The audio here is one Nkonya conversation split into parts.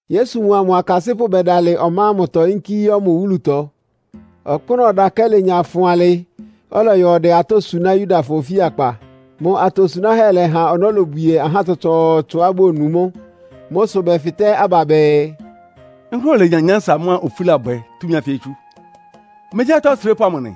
Yesu mʋa mʋ akasɩ́pʋ́ bɛdalɩ ɔmá ámʋtɔ yínkí yɔ́ mʋ wúlutɔ. Ɔkpʋ́nʋ́ ɔdakɛ́ lenya fʋn alɩ, ɔlɔyɔ ɔdɛ atɔ́ suná Yudafɔ ofíakpa. Mʋ atosunáhɛ́ lɛha ɔnɔ́ lobwie ahá tsɔtsɔɔtsɔá bonu mʋ́. Mʋ́ sʋ bɛfɩtɛ́ aba bɛɛ, “Nkʋ́nʋ́ olenya nyánsa mʋ́a ofúlábwɛ túmi ánfɩ ɛ́ tsú? Megyí atɔ́ osrépʋ́ amʋ nɩ.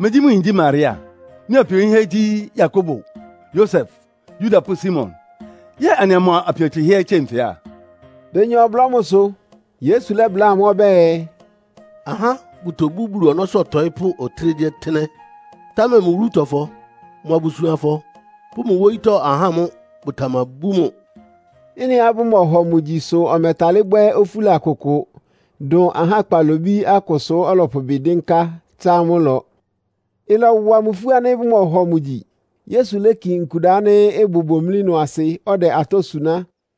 Megyí mʋ yin gyí Maria, mʋ apio yinhɛ́ gyí Yakobo, Yosef, Yuda pʋ́ Simon? Yɛ́ɛ anɩa mʋ apio tsɩhɛ́ ɛ́ tsie nfɩ á?” Benya ɔblɔ́ mʋsʋ. Yesu lɛ́bláa amʋ́ ɔbɛ́ɛ, “Ahá bʋtobú Bulu ɔnɔ́sʋ́ ɔtɔɩ́pʋ́ ɔtɩ́nɛgyíɔtɩ́nɛ́, támɛ mʋ wúlutɔfɔ, mʋ abusuanfɔ pʋ́ mʋ wóyítɔ́ ahá mʋ́ bʋtamabú mʋ.” Ɩ́nɩá bʋmɔhɔ mʋ gyi sʋ ɔmɛtalɩ́ bwɛ́ ofúla kʋkʋ, dʋn ahá kpalobí akʋsʋ ɔ́lɔpʋ ɩbɩ dɩ́nká, tsá amʋ́ ɩlɔ. Ɩlɔwa mʋ ifú ánɩ́ bʋmɔhɔ mʋ gyi. Yesu léki nkuda ánɩ́ ɩbʋ bomlí ɩnʋ asɩ, ɔdɛ atɔ́ suná.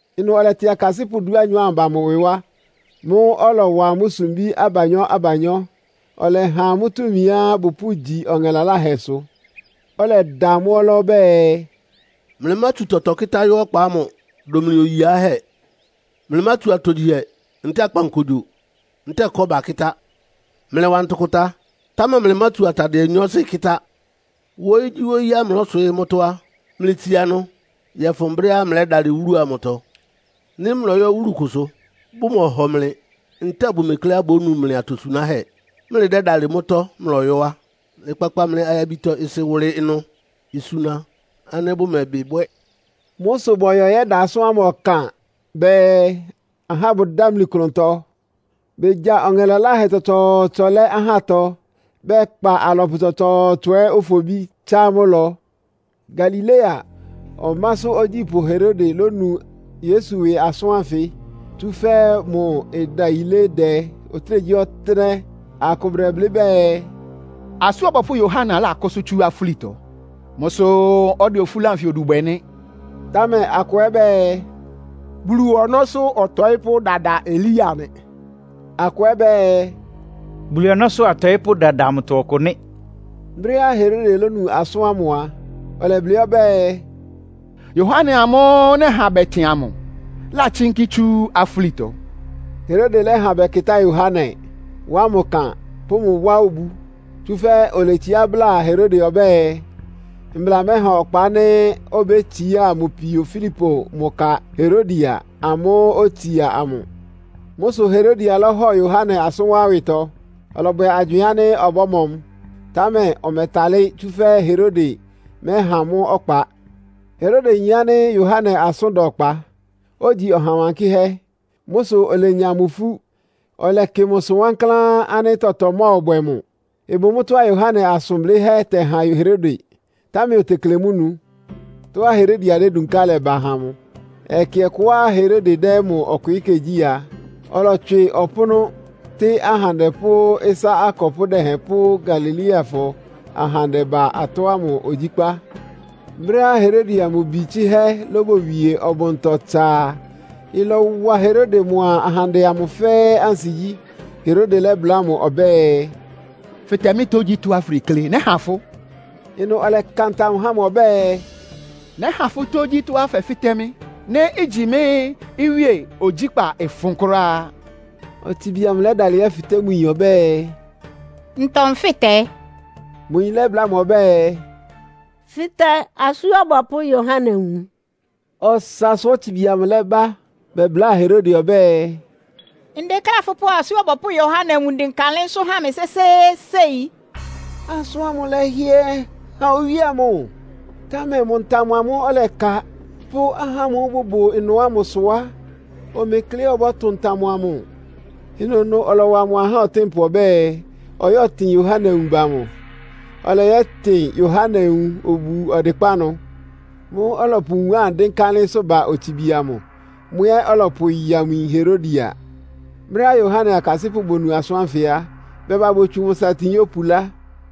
Ɩnʋ ɔlɛtɩ akasɩ́pʋ́ dúanyɔ ámʋ ba mʋ ɩwɩ wá. Mʋ́ʋ́ ɔlɔwa amʋ́ sumbí abanyɔ́-abanyɔ́. Ɔlɛha amʋ́ túmiá bɔ́pʋgyi ɔŋɛ laláhɛsʋ. Ɔlɛda amʋ́ ɔlá ɔbɛ́ɛ, “Mlɩmátsu tɔtɔ kɩ́tá yɔ́ ɔkpa ámʋ, dʋn mlɩ oyi yiáhɛ́! Mlɩmátsu atogyihɛ ntɛ́ɛ akpankogyo, ntɛ́ɛ kɔ́ba kɩ́tá! Mlɩwa ntʋkʋta, támɛ mlɩmátsu atadɩɛ nyɔɔsɩ kɩ́tá! Wóyígyíwóyíá mlɔswɩ́ɩ́ mʋ́tɔ́ á, mlɩtsia ɩnʋ yɔ́fʋn brɛ́á mlɛ́dalɩ wúlu amʋtɔ. Nɩ́ mlɔyɔ́ wúlu kʋsʋ, bʋmɔhɔ mlɩ, ntɛ́ɛ bʋmekleá bónu mlɩ atosunáhɛ́, mlɩdɛ́dalɩ mʋ́tɔ́ mlɔyɔ́ á, mlɩkpakpa mlɩ ayabitɔ-ɩsɩ wʋlɩ ɩnʋ, isuna ánɩ́ bʋmɛbɩ bwɛ́.” Mʋ́ sʋ bɔyɔ yɛ́da asʋ́n ámʋ ɔkan bɛɛ, ahá bʋdámli klʋntɔ. Begya ɔŋɛ laláhɛ tsɔtsɔɔtsɔ lɛ́ ahátɔ, bɛkpa alɔpʋ tsɔtsɔɔtsɔ ɛ́ ofobí, tsá amʋ́ ɩlɔ. Galilea ɔmásʋ́ ogyípʋ́ Herode lónu Yesu ɩwɩ asʋ́n ánfɩ, tsúfɛ́ mʋ ɩdayilé dɛ ɔtɩ́nɛgyíɔtɩ́nɛ́. Akʋ bʋdɛblɩ́ bɛɛ, “Asú Ɔbɔpʋ́ Yohane lákʋ́sʋ́ tsú afúlitɔ. Mʋ́ sʋ́, ɔdɛ ofúla anfɩ odu bwɛ nɩ́.” Támɛ akʋ ɛ́ bɛɛ, “Bulu ɔnɔ́sʋ́ ɔtɔɩ́pʋ́ dada Elia nɩ́.” Akʋ ɛ́ bɛɛ, “Bulu ɔnɔ́sʋ́ atɔɩ́pʋ́ dada amʋtɔ ɔkʋ nɩ́.” Brɛ́á Herode lónu asʋ́n ámʋ a, ɔlɛblɩ́ ɔbɛ́ɛ, “Yohane amʋ́ʋ́ nɛha bɛtɩn amʋ látsínkí tsú afúlitɔ.” Herode lɛ́ha bɛkɩtá Yohane, wá mʋ ɩkan, pʋ́ mʋ wá obu. Tsúfɛ́ oletsiá bláa Herode ɔbɛ́ɛ, mbla mɛha ɔkpa ánɩ́ obétsiá mʋ pio Filipo mʋ ka Herodia amʋ́ʋ́ otsia amʋ. Mʋ́ sʋ Herodia lɔ́hɔ Yohane asʋ́n wá ɩwɩtɔ. Ɔlɔbwɛ agywɩɩn ánɩ́ ɔbɔ́mɔ mʋ, támɛ ɔmɛtálɩ́, tsúfɛ́ Herode mɛ́há mʋ́ ɔkpa. Herode yin ánɩ́ Yohane asʋ́n da ɔkpa, ogyi ɔha wankɩ́hɛ́. Mʋ́ sʋ olenya mʋ ifú, ɔlɛkɩ mʋsʋ wankláán ánɩ́ tɔtɔ mɔ́ɔbwɛ mʋ. Ɩbʋ mʋ́tɔ́á Yohane asʋn blɩ́hɛ́ tɛhan Herode, támɛ otekle mʋ́ nu. Tɔ́á Herodia dédunká lɛ́ba ha mʋ. Ɛkɛ ɔkʋá Herode dɛ́ mʋ ɔkwɩɩ́kɛ́ gyí a, ɔlɔtswɩ ɔpʋ́nʋ́, tɩ́ ahandɛ pʋ́ ɩsá akɔpʋ́ dɛhɛn pʋ́ Galileafɔ ahandɛ ba atɔ́ ámʋ ogyíkpá. Brɛ́á Herodia mʋ bi tsɩ́hɛ́ lóbowie ɔbʋntɔ tsa a, ɩlɔwa Herode mʋa ahandɛ amʋ fɛ́ɛ́ ansigyí. Herode lɛ́bláa mʋ ɔbɛ́ɛ, “Fɩtɛ mɩ́ tógyítɔ́á fʋdeklé, nɛ́ha fʋ́.” Ɩnʋ ɔlɛka ntam há mʋ ɔbɛ́ɛ, “Nɛ́ha fʋ́ tótógyítɔ́á fɛ́fɩtɛ́ mɩ́. Nɩ́ igyi mɩ́ iwíe ogyíkpá ɩfʋn kʋ́ráá.” Otsibi amʋ lɛ́dalɩ yɛ́fɩtɛ́ mʋ yin ɔbɛ́ɛ, “Ntɔ nfɩ́tɛ?” Mʋ yin lɛ́bláa mʋ ɔbɛ́ɛ, “Fɩtɛ Asú Ɔbɔpʋ́ Yohane nwun.” Ɔsasʋ otsibi amʋ lɛ́ba bɛbláa Herode ɔbɛ́ɛ, “Ndekléá fʋpʋ́ Asú Ɔbɔpʋ́ Yohane nwun dɩnka ɩlɩ́nsʋ́ ha mɩ sésééséi.” Asʋ́n ámʋ lɛ́hɩɛ han owíe amʋ, támɛ mʋ ntam amʋ́ʋ́ ɔlɛka, pʋ́ ahá ámʋ́ʋ́ bʋbʋ ɩnʋ ámʋ sʋ á, omekleá ɔbɔ́tʋn ntam amʋ. Ɩnʋnʋ ɔlɔwa mʋ ahá ɔtɩ́npʋ ɔbɛ́ɛ, ɔyɛ́tɩn Yohane nwun ba mʋ. Ɔlɔyɔ yɛ́tɩn Yohane nwun obu ɔdɩkpá ɩnʋ. Mʋ́ʋ́ ɔlɔpʋ nwun ámʋ dɩ́nká ɩlɩ́nsʋ́ ba otsibi amʋ, mʋ ɛ́ ɔlɔpʋyáa mʋ yin Herodia. Brɛ́á Yohane akasɩ́pʋ́ bonu asʋ́n ánfɩ á, bɛba botsu mʋ satin yópulá.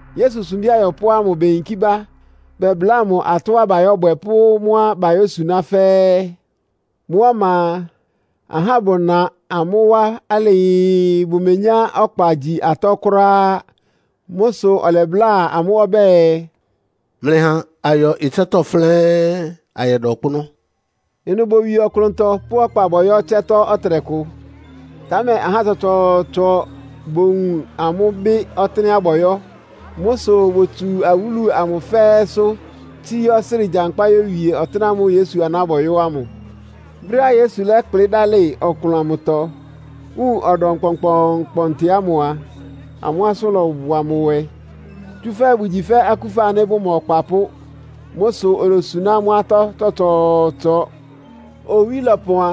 Yesu sumbí ayɔpʋ́ ámʋ beyinkí bá bɛbláa mʋ atɔ́á bayɔ́bwɛ pʋ́ mʋ́á bayósuná fɛ́ɛ́. Mʋ́ ɔma a, ahá bʋna amʋ́ wá alɩɩ, bʋmenyá ɔkpa gyi atɔ́ kʋ́ráá. Mʋ́ sʋ ɔlɛbláa amʋ́ ɔbɛ́ɛ, “Mlɩha ayɔ ɩtsɛ́tɔ́ flɛ́ɛ́n, ayɛda ɔkpʋ́nʋ́.” Ɩnʋ bowie ɔklʋntɔ, pʋ́ ɔkpa bɔyɔ́ ɩtsɛ́tɔ́ ɔtɩnɛkʋ. Támɛ ahá tsɔtsɔɔtsɔ bowun amʋ́, bɩ́ ɔtɩ́nɛ́á bɔyɔ́. Mʋ́ sʋ botsu awúlu ámʋ fɛ́ɛ́sʋ́, tsíí ɔsrɩ́ɩ gyankpá yówie ɔtɩ́nɛ́ ámʋ́ʋ́ Yesu aná bɔyɔ́ ámʋ. Brɛ́á Yesu lɛ́kplɩ́ dálɩ ɔklʋn amʋtɔ, wun ɔdɔm kpɔnkpɔɔnkpɔntɩ ámʋ a, amʋ́ asʋ́n lɔwa mʋ nwɛ, tsúfɛ́ bʋgyi fɛ́ akúfa ánɩ́ bʋma ɔkpapʋ́. Mʋ́ sʋ olosuná amʋ́ atɔ́ tsɔtsɔɔtsɔ. Owí lɔpɔn a,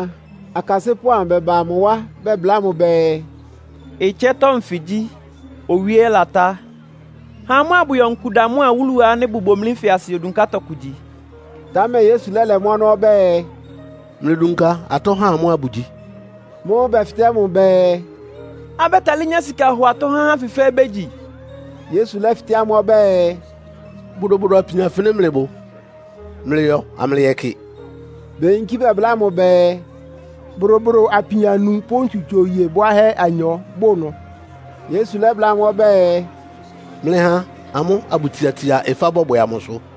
akasɩ́pʋ́ amʋ bɛba mʋ wá bɛbláa mʋ bɛɛ, “Ɩtsɛ́tɔ́ nfɩ gyí, owí ɛ́ latá. Ha amʋ́ abʋyɔ nkuda mʋ́a awúlu ánɩ́ ɩbʋ bomlí nfɩ asɩ yodunká tɔkʋ gyi.” Támɛ Yesu lɛ́lɛ mʋ́ ɔnɔ́ ɔbɛ́ɛ, “Mlɩdunka atɔ́ ha amʋ́ abʋgyi.” Mʋ́ʋ́ bɛfɩtɛ́ mʋ bɛɛ, “Abɛ́talɩ́ nyá sika hɔ atɔ́ há ahá ánfɩ fɛ́ɛ́ bégyi?” Yesu lɛ́fɩtɛ́ amʋ́ ɔbɛ́ɛ, “Bodobodo apin afɩnɩ mlɩbʋ? Mlɩyɔ amlɩyɛkɩ!” Beyinkí bɛbláa mʋ bɛɛ, “Bodobodo apin anu pʋ́ ntsutso iye bwáhɛ́ anyɔ bʋ ɩnʋ.” Yesu lɛ́bláa amʋ́ ɔbɛ́ɛ, “Mlɩha amʋ́ abʋtsiatsia ɩfá bɔbwɛ amʋsʋ.”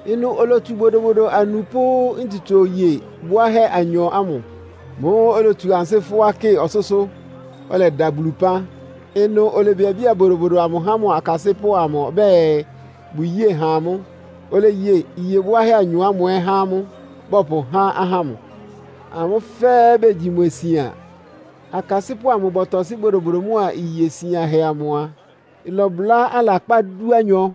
Ɩnʋ olotsu bodobodo anu pʋ́ ntsutso iye bwáhɛ́ anyɔ ámʋ. Mʋ́ʋ́ olotsu ansɩ́ fʋ́á kɩ ɔsʋ́sʋ́, ɔlɛda Bulu ɩpán. Ɩnʋ olebiabía bodobodo amʋ há mʋ akasɩ́pʋ́ amʋ ɔbɛ́ɛ, bʋyée ha amʋ́. Oleye iye bwáhɛ́ anyɔ ámʋ ɛ́ há amʋ́, bɔpʋhá ahá ámʋ. Amʋ́ fɛ́ɛ́ begyi mwɛ sian. Akasɩ́pʋ́ amʋ bɔtɔsɩ́ bodobodo mʋ́a iye sianhɛ amʋ a, ɩlɔbʋlá alakpá dúanyɔ.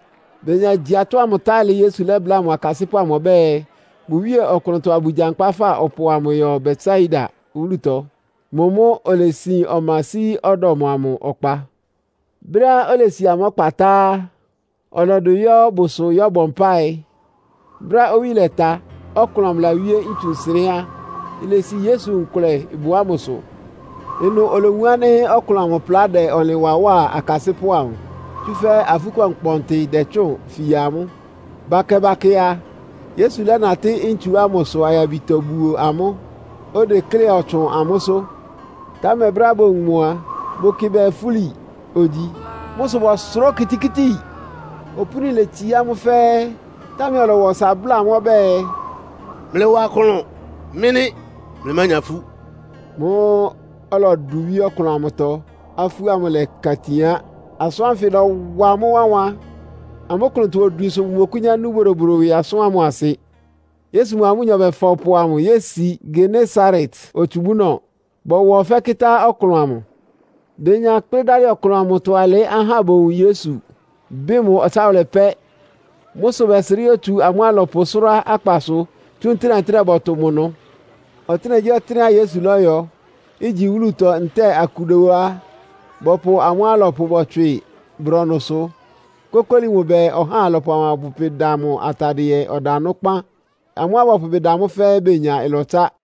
Benya gyi atɔ́ ámʋ tá alɩ, Yesu lɛ́bláa akasɩ́pʋ́ amʋ ɔbɛ́ɛ, bʋwíe ɔklʋntɔ abʋgyankpa fa ɔpʋ amʋ yɔ Betsaida wúlutɔ. Mʋ mʋ́ olesin ɔma sí ɔdɔm amʋ ɔkpa. Brɛ́á olesi amʋ́ ɔkpa tá á, ɔlɔdʋ yɔ́ bʋsʋ yɔ́bɔ mpáɩ. Brɛ́á owí lɛta, ɔklʋn amʋ lawíé ntsu nsɩnɛ́ á, ilesi Yesu nkʋlɛ ɩbʋ ámʋsʋ. Ɩnʋ olowun ánɩ́ ɔklʋn amʋ plá dɛ ɔnlɩn wa wá akasɩ́pʋ́ amʋ, tsúfɛ́ afú kpɔnkpɔntɩ dɛtsʋ́ʋn fia amʋ́. Bakɛ-bakɛ a, Yesu lɛ́natɩ́ ntsu ámʋsʋ ayabitɔ buo amʋ́, odeklé ɔtsʋn amʋ́sʋ́. Támɛ brɛ́á bowun mʋ a, bʋkɩ bɛɛ, fúli ogyi. Mʋ́ sʋ bɔsʋrá okitikíti. Opúni letsií amʋ́ fɛ́ɛ́. Támɛ ɔlɔwa ɔsa bláa amʋ́ ɔbɛ́ɛ, “Mlɩwa klʋn. Mɩ́ nɩ́. Mlɩmánya ifú.” Mʋ́ʋ́ ɔlɔdʋ wíé ɔklʋn amʋtɔ, afú ámʋ lɛka itin á. Asʋ́n ánfɩ lɔ́wa amʋ́ wánwan. Amʋ́ klʋntɔ-odwin sʋ bʋmɔkʋ́nyá nú bodobodo ɩwɩ asʋ́n ámʋ asɩ. Yesu mʋa amʋ́nyɔ bɛfa ɔpʋ amʋ yési Genesaret otsubúnɔ, bɔwa ɔfɛ́ kɩ́tá ɔklʋn amʋ. Benya kplɩ́ dálɩ ɔklʋn amʋtɔ alɩ́ ahá bowun Yesu, bɩ́ mʋ ɔtsáwʋlɛ pɛ́. Mʋ́ sʋ bɛsrɩ́ yótsu amʋ́ alɔpʋ sʋ́rá akpasʋ, tsú ntɩ́nɛ́-ntɩ́nɛ́ bɔtʋ mʋ ɩnʋ. Ɔtɩ́nɛgyíɔtɩ́nɛ́á Yesu lɔ́yɔ, igyi wúlutɔ ntɛ́ɛ akuda ó á, bɔpʋ amʋ́ alɔpʋ bɔtswɩ brɔnʋsʋ, kókóli mʋ bɛɛ, ɔhá alɔpʋ amʋ abʋpʋ ɩbɩ da mʋ atadɩɛ ɔdanʋ́ kpán. Amʋ́á bɔpʋ ɩbɩ da mʋ́ fɛ́ɛ́ benya ɩlɔtsá.